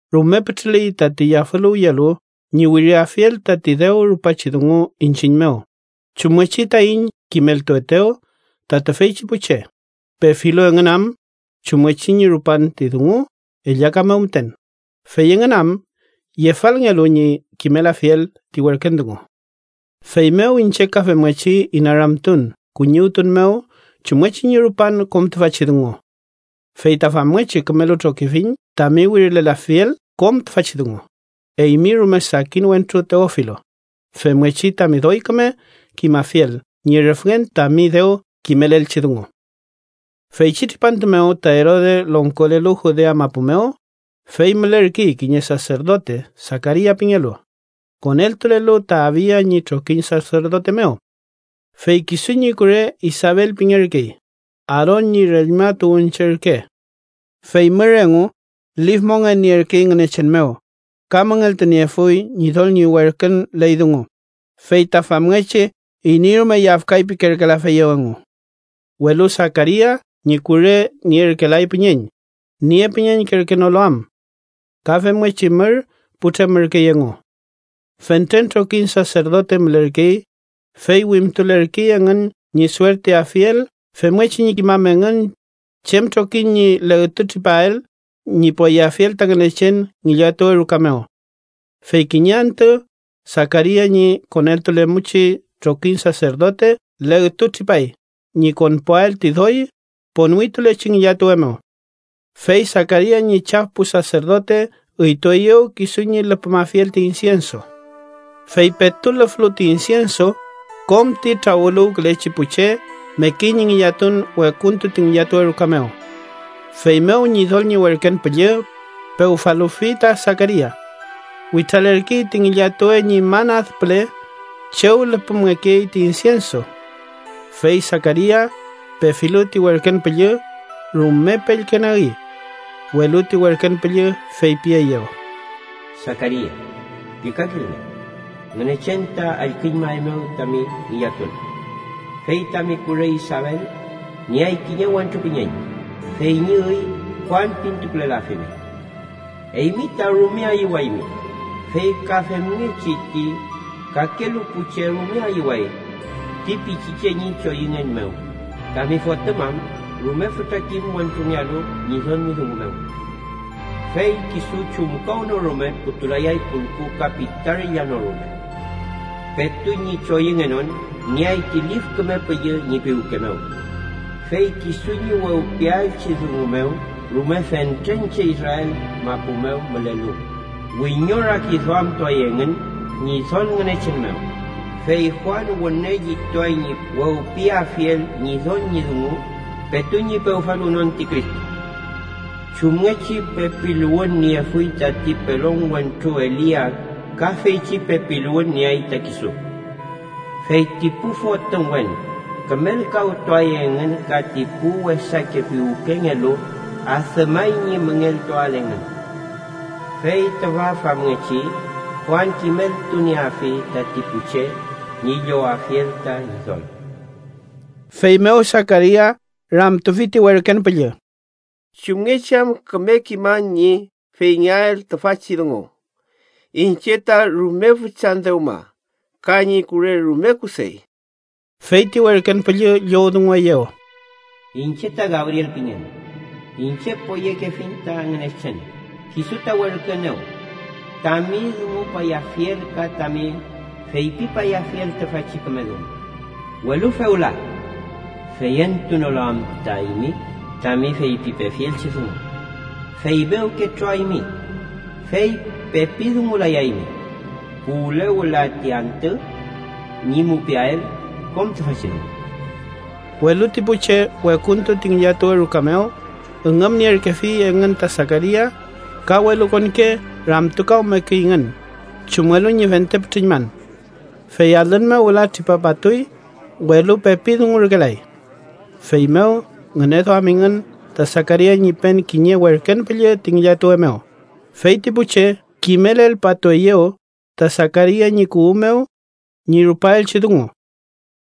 Rume pütrüley tati yafüluwyelu ñi wiriafiel tati dew rupachi dungu iñchiñ mew, chumngechi taiñ kimeltuetew ta tüfeychi pu che, pefilu engün am chumngechi ñi rupan ti dungu ellaka mew müten, fey engün am yefalngelu ñi kimelafiel ti werken dungu. Feymew iñche ka femngechi inaramtun kuñiwtun mew chumngechi ñi rupan kom tüfachi dungu. Fey ta famngechi kümelu trokifiñ tami wirilelafiel kom tüfachi dungu, eymi rume sakin wentru Teofilo, femngechi tami doy küme kimafiel ñi rüfngen tami dew kimelelngeelchi dungu. Feychi tripantu mew ta Erode longkolelu Judea mapu mew, fey mülerkey kiñe saserdote Sakaria pingelu, koneltulelu ta Abia ñi trokiñ saserdote mew. Fey kisu ñi kure Isabel pingerkey, Aaron ñi reñma tuwünche ürke. Fey mür engu lif mongen nierkey Ngünechen mew ka müngeltuniefuy Ñidol ñi werkün ley dungu, fey ta famngechi iney rume yafkay pirkelayafeyew engu. Welu Sakaria ñi kure nierkelay püñeñ, niepüñeñkerkenolu am. Ka femngechi mür putremürkey engu. Fentren trokiñ saserdote mülerkey, fey wimtulerkey engün ñi suertiafiel femngechi ñi kimam engün chem trokiñ ñi legtu tripael ñi poyeafiel ta Ngünechen ngillatuwe ruka mew. Fey kiñe antü, Sakaria ñi koneltulemumchi trokiñ saserdote legtu tripay ñi konpuael ti doy ponwitulechi ngillatuwe mew. Fey Sakaria ñi chaf pu saserdote üytueyew kisu ñi lüpümafiel ti insienso. Fey petu lüflu ti insienso, kom ti trawüluwkülechi pu che mekey ñi ngillatun wekuntu ti ngillatuwe ruka mew. Feymew Ñidol ñi werken püllü pewfaluwfi ta Sakaria. Witralerkey ti ngillatuwe ñi man ad püle chew lüpümngekey ti insienso. Fey Sakaria, pefilu ti werken püllü, rume pellkenagi. Welu ti werken püllü feypieyew: —Sakaria, llükakilnge. Ngünechen ta allküñmaeymew tami ngillatun, fey tami kure Isabel nieay kiñe wentru püñeñ, fey ñi üy Juan pintukulelafimi. Eymi ta rume ayüwaymi, fey ka femngechi ti kakelu pu che rume ayüway ti pichiche ñi choyüngen mew, tami fotüm am rume fütra kim wentrungealu Ñidol ñi dungu mew. Fey kisu chumkawnorume putulayay pulku ka pitarilla no rume. Petu ñi choyüngenon, nieay ti Lif Küme Püllü ñi piwke mew. Fey kisu ñi wewpiaelchi dungu mew rume fentren che, Israel mapu mew mülelu, wiñorakiduamtuay engün Ñidol Ngünechen mew. Fey Juan wüne llituay ñi wewpiyeafiel Ñidol ñi dungu petu ñi pewfaluwnon ti Cristo. Chumngechi pepiluwün niefuy tati pelon wentru Elia ka feychi pepiluwün nieay ta kisu. Fey ti pu fotümwen kümelkawtuay engün ka ti pu wesake piwkengelu adümay ñi müngeltuael engün. Fey tüfa famngechi Juan kimeltunieafi tati pu che ñi llowafiel ta Ñidol. Feymew Sakaria ramtufi ti werken püllü: —¿Chumngechi am küme kiman ñi feyngeael tüfachi dungu? Iñche ta rume füchan dewma ka ñi kure rume kusey. Fey ti werken püllü llowdungueyew: —Iñche ta Gabriel pingen, iñche poyekefiñ ta Ngünechen. Kisu ta werküenew tami dungupayafiel ka tami feypipayafiel tüfachi küme dungu. Welu fewla, feyentunolu am ta eymi tami feypipefielchi dungu, feymew ketroaymi. Fey pepi dungulayaymi puwle wüla ti antü ñi mupiael kom tüfachi dungu. Welu ti pu che wekuntu ti ngillatuwe ruka mew üngümnierkefi engün ta Sakaria ka welukonke ramtukawmekeyngün chumngelu ñi fente pütrüñman. Fey alün mew wüla tripapatuy, welu pepi dungurkelay. Feymew ngüneduamingün ta Sakaria ñi pen kiñe werken püllü ti ngillatuwe mew, fey ti pu che kimelelpatueyew ta Sakaria ñi kuwü mew ñi rupaelchi dungu.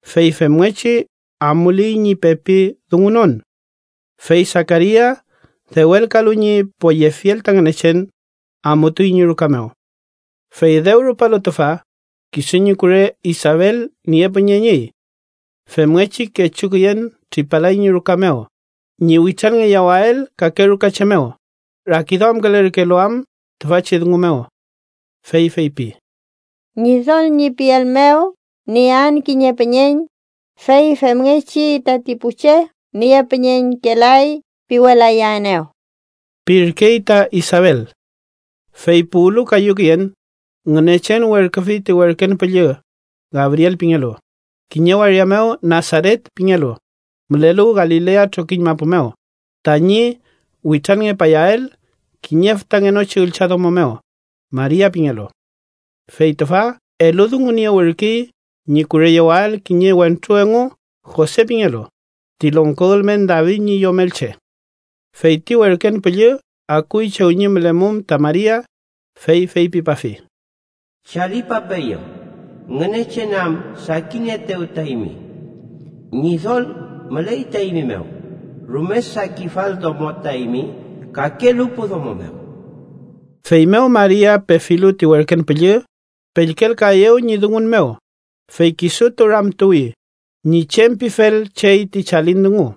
Fey femngechi amuley ñi pepi dungunon. Fey Sakaria dewelkalu ñi poyefiel ta Ngünechen, amutuy ñi ruka mew. Fey dew rupalu tüfa, kisu ñi kure Isabel niepüñeñüy. Femngechi kechu küyen tripalay ñi ruka mew ñi witranngeyawael kake rukache mew, rakiduamkülerkelu am tüfachi dungu mew. Fey feypi: “Ñidol ñi piel mew niean kiñe püñeñ, fey femngechi tati pu che ‘niepüñeñkelay’ piwelayaenew” pirkey ta Isabel. Fey puwlu kayu küyen, Ngünechen werküfi ti werken püllü, Gabriel pingelu, kiñe waria mew Nasaret pingelu, mülelu Galilea trokiñ mapu mew, tañi witranngepayael kiñe fütangenochi üllchadomo mew, Maria pingelu. Fey tüfa eludunguniewürkey ñi kureyewael kiñe wentru engu Jose pingelu, ti longko ülmen David ñi yomelche. Fey ti werken püllü akuy chew ñi mülemum ta Maria, fey feypipafi: —¡Chalipapeeyu, Ngünechen am sakinieetew ta eymi! Ñidol müley ta eymi mew. Rume sakifal domo ta eymi kakelu pu domo mew. Feymew Maria pefilu ti werken püllü, pellkelkaeyew ñi dungun mew, fey kisutu ramtuwi ñi chem pifel chey ti chalin dungu.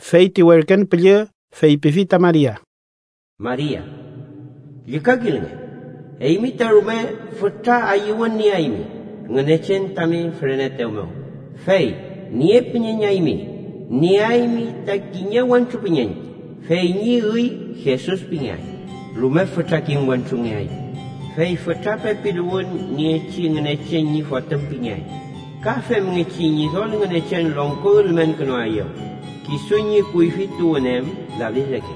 Fey ti werken püllü feypifi ta Maria: —Maria, llükakilnge. Eymi ta rume fütra ayüwün nieaymi Ngünechen tami füreneetew mew. Fey niepüñeñaymi. Nieaymi ta kiñe wentru püñeñ, fey ñi üy Jesus pingeay. Rume fütra kim wentrungeay, fey fütra pepiluwün niechi Ngünechen ñi Fotüm pingeay. Ka femngechi Ñidol Ngünechen longko ülmenkünuaeyew, kisu ñi kuyfi tuwün em David reke,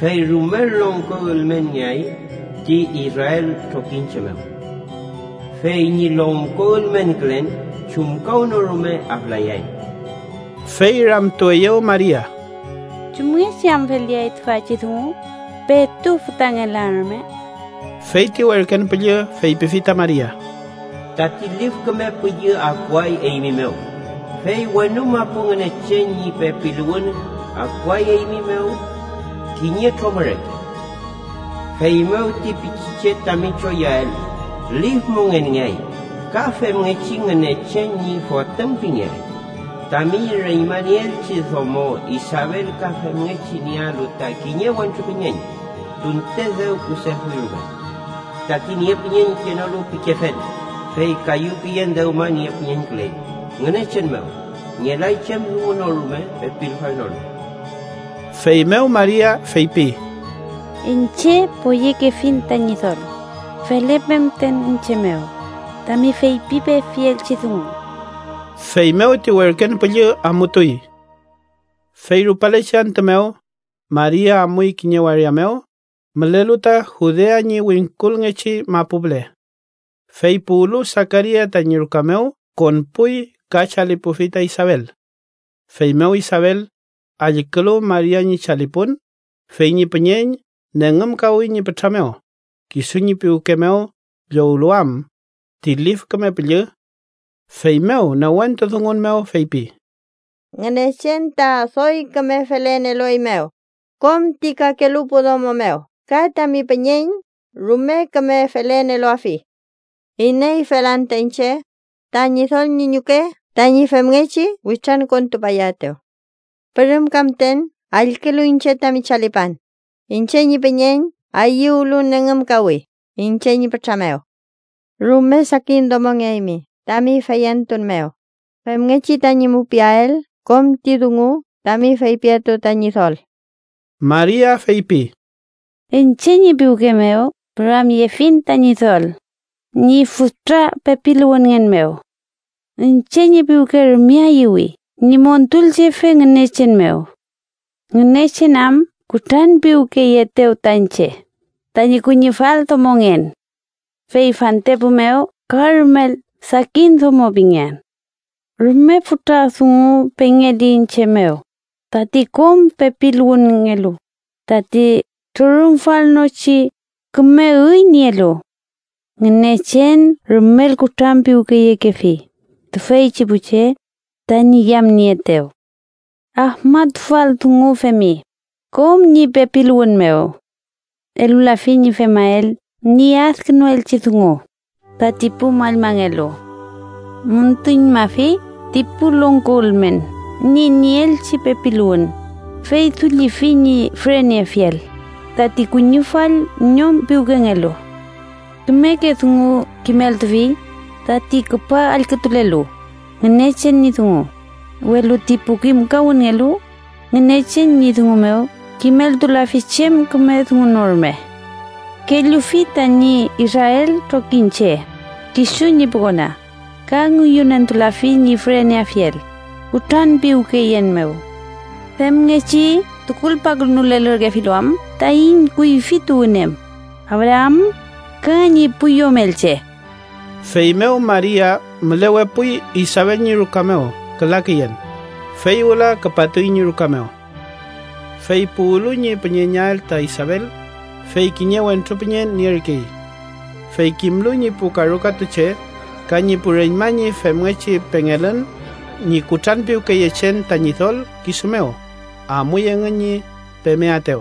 fey rumel longko ülmenngeay ti Israel trokiñche mew. Fey ñi longko ülmenkülen chumkawnorume aflayay. Fey ramtueyew Maria: —¿Chumngechi am feleay tüfachi dungu? Petu fütangelan rume. Fey ti werken püllü feypifi ta Maria: —Tati Lif Küme Püllü akuay eymi mew, fey wenu mapu Ngünechen ñi pepiluwün akuay eymi mew kiñe tromü reke. Feymew ti pichiche tami choyüael Lif Mongenngeay ka femngechi Ngünechen ñi Fotüm pingeay. Tami reñmanieelchi domo Isabel ka femngechi niealu ta kiñe wentru püñeñ, tunte dew kusefuy rume. Tati niepüñeñkenolu pikefel, fey kayu küyen dewma niepüñeñküley. Ngünechen mew ngelay chem dungu no rume pepilfalnolu. Feymew Maria feypi: —Iñche poyekefiñ ta Ñidol. Felepe müten iñche mew tami feypipefielchi dungu. Feymew ti werken püllü amutuy. Fey rupalechi antü mew, Maria amuy kiñe waria mew mülelu ta Judea ñi wingkulngechi mapu püle. Fey puwlu Sakaria tañi ruka mew, konpuy ka chalipufi ta Isabel. Feymew Isabel, allkülu Maria ñi chalipun, fey ñi püñeñ nengümkawi ñi pütra mew, kisu ñi piwke mew llowlu am ti Lif Küme Püllü. Feymew newentu dungun mew feypi: —¡Ngünechen ta doy küme felen elueymew kom ti kakelu pu domo mew ka tami püñeñ rume küme felen eluafi! ¿Ineyfel anta iñche, ta Ñidol ñi ñuke tañi femngechi witrankontupayaetew? Pürümka müten allkülu iñche tami chalipan, iñche ñi püñeñ ayüwlu nengümkawi iñche ñi pütra mew. Rume sakin domongeaymi tami feyentun mew femngechi tañi mupiael kom ti dungu tami feypietew ta Ñidol. Maria feypi: “Iñche ñi piwke mew püramyefiñ ta Ñidol ñi fütra pepiluwünngen mew. Iñche ñi piwke rume ayüwi ñi Montulchefe Ngünechen mew, Ngünechen am kutranpiwkeyeetew ta iñche, tañi kuñifal domongen. Fey fantepu mew ka rumel sakin domo pingean. Rume fütra dungu pengeli iñche mew tati kom pepiluwünngelu, tati ¡trürümfalnochi küme üy nielu! Ngünechen rumel kutranpiwkeyekefi tüfeychi pu che tañi yamnieetew. Afmatufal dungu femi kom ñi pepiluwün mew. Elulafi ñi femael ñi adkünuelchi dungu tati pu mallmangelu. Müntuñmafi ti pu longko ülmen ñi nieelchi pepiluwün, fey dullifi ñi füreneafiel tati kuñifall ñom piwkengelu. Kümeke dungu kimeltufi tati küpa allkütulelu Ngünechen ñi dungu, welu ti pu kimkawünngelu Ngünechen ñi dungu mew kimeltulafi chem küme dungu no rume. Kellufi tañi Israel trokiñche, kisu ñi pu kona, ka ngüyünentulafi ñi füreneafiel kutranpiwkeyen mew. Femngechi tukulpakünulelürkefilu am taiñ kuyfi tuwün em, Abraam, ka ñi pu yomelche.” Feymew Maria mülewepuy Isabel ñi ruka mew küla küyen, fey wüla küpatuy ñi ruka mew. Fey puwlu ñi püñeñael ta Isabel, fey kiñe wentru püñeñ nierkey. Fey kimlu ñi pu karukatu che ka ñi pu reñma ñi femngechi pengelün ñi kutranpiwkeyechen ta Ñidol kisu mew, amuy engün ñi pemeaetew.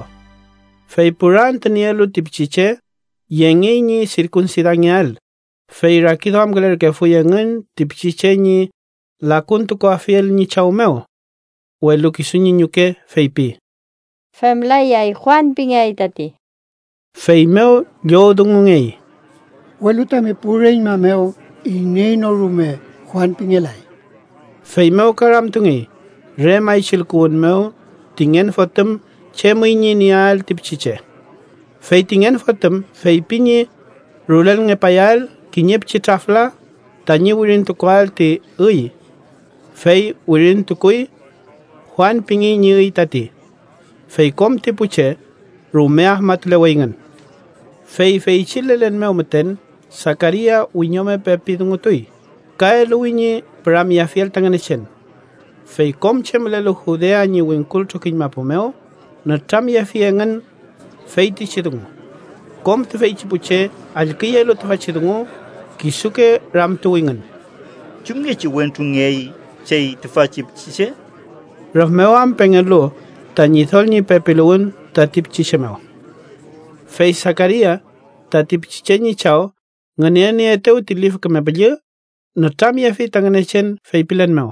Fey pura antü nielu ti pichiche, yengey ñi sirkunsidangeael, fey rakiduamkülerkefuy engün ti pichiche ñi lakuntukuafiel ñi chaw mew. Welu kisu ñi ñuke feypi: —Femlayay. Juan pingeay tati. Feymew llowdungungey: —Welu tami pu reñma mew iney no rume Juan pingelay. Feymew ka ramtungey re maychilkuwün mew ti ngen fotüm chem üy ñi nieael ti pichiche. Fey ti ngen fotüm feypi ñi rulelngepayael kiñe pichi trafla tañi wirintukuael ti üy. Fey wirintukuy: “Juan pingey ñi üy tati”. Fey kom ti pu che rume afmatuleweyngün. Fey feychi lelen mew müten Sakaria wiñome pepi dungutuy, ka eluwi ñi püramyeafiel ta Ngünechen. Fey kom che mülelu Judea ñi wingkul trokiñ mapu mew nütramyefi engün feytichi dungu. Kom tüfeychi pu che allküyelu tüfachi dungu, kisuke ramtuwingün: “¿Chumngechi wentrungeay chey tüfachi pichiche?” rüf mew am pengel-lu ta Ñidol ñi pepiluwün tati pichiche mew. Fey Sakaria, tati pichiche ñi chaw, ngünenieetew ti Lif Küme Püllü, nütramyefi ta Ngünechen feypilen mew: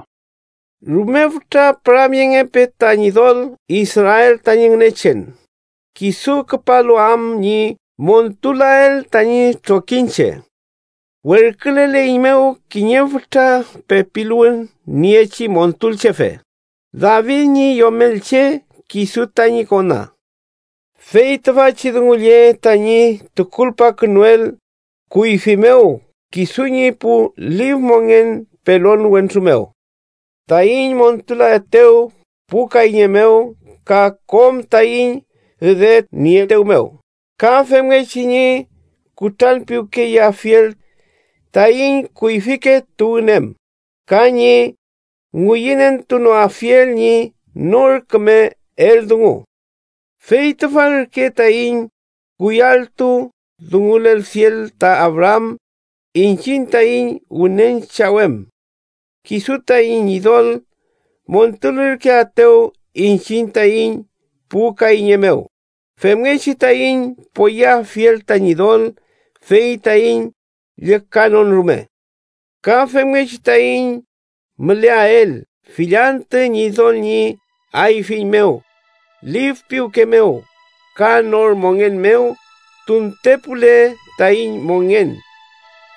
“¡Rume fütra püramyengepe ta Ñidol, Israel tañi Ngünechen, kisu küpalu am ñi montulael tañi trokiñche! Werküleleiñmew kiñe fütra pepiluwün niechi Montulchefe, David ñi yomelche, kisu tañi kona. Fey tüfachi dungu lle tañi tukulpakünuel kuyfi mew kisu ñi pu lif mongen pelon wentru mew: Taiñ montulaetew pu kayñe mew ka kom taiñ üdenieetew mew ka femngechi ñi kutranpiwkeyeafiel taiñ kuyfike tuwün em ka ñi ngüyünentunoafiel ñi nor küme eldungu. Fey tüfa ürke tañi kuyalltu dungulelfiel ta Abraam iñchiñ taiñ wünen chaw em: kisu taiñ Ñidol montulürkeaetew iñchiñ taiñ pu kayñe mew, femngechi taiñ poyeafiel ta Ñidol fey taiñ llükanon rume. Ka femngechi taiñ müleael fill antü Ñidol ñi ayfiñ mew lif piwke mew ka nor mongen mew tuntepule taiñ mongen.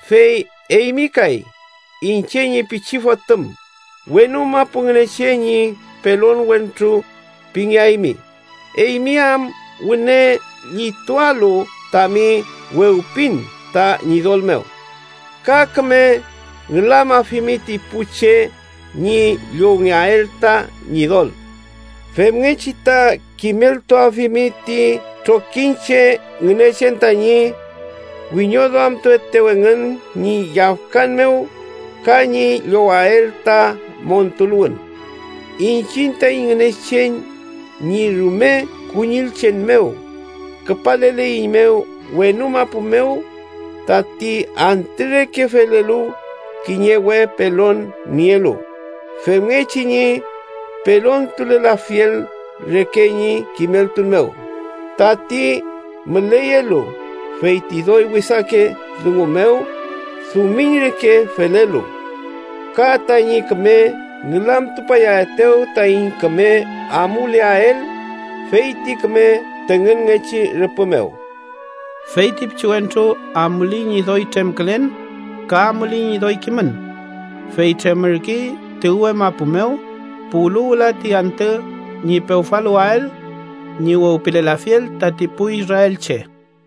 Fey eymi kay, iñche ñi pichi fotüm, wenu mapu Ngünechen ñi pelon wentru pingeaymi, eymi am wüne llitualu tami wewpin ta Ñidol mew. Ka küme ngülamafimi ti pu che ñi llowngeael ta Ñidol. Femngechi ta kimeltuafimi ti trokiñche Ngünechen tañi wiñoduamatuaetew engün ñi yafkan mew ka ñi llowael ta montuluwün. Iñchiñ taiñ Ngünechen, ñi rume kuñillchen mew küpaleleiñmew wenu mapu mew, tati antü reke felelu kiñe we pelon nielu, femngechi ñi pelontulelafiel reke ñi kimeltun mew tati müleyelu feyti doy wesake dungu mew dumiñ reke felelu, ka taiñ küme ngülamtupayaetew taiñ küme amuleael feyti küme tüngünngechi rüpü mew.” Fey ti pichiwentru amuley ñi doy tremkülen ka amuley ñi doy kimün, fey tremürkey ti uwe mapu mew puwlu wüla ti antü ñi pewfaluwael ñi wewpilelafiel tati pu israelche.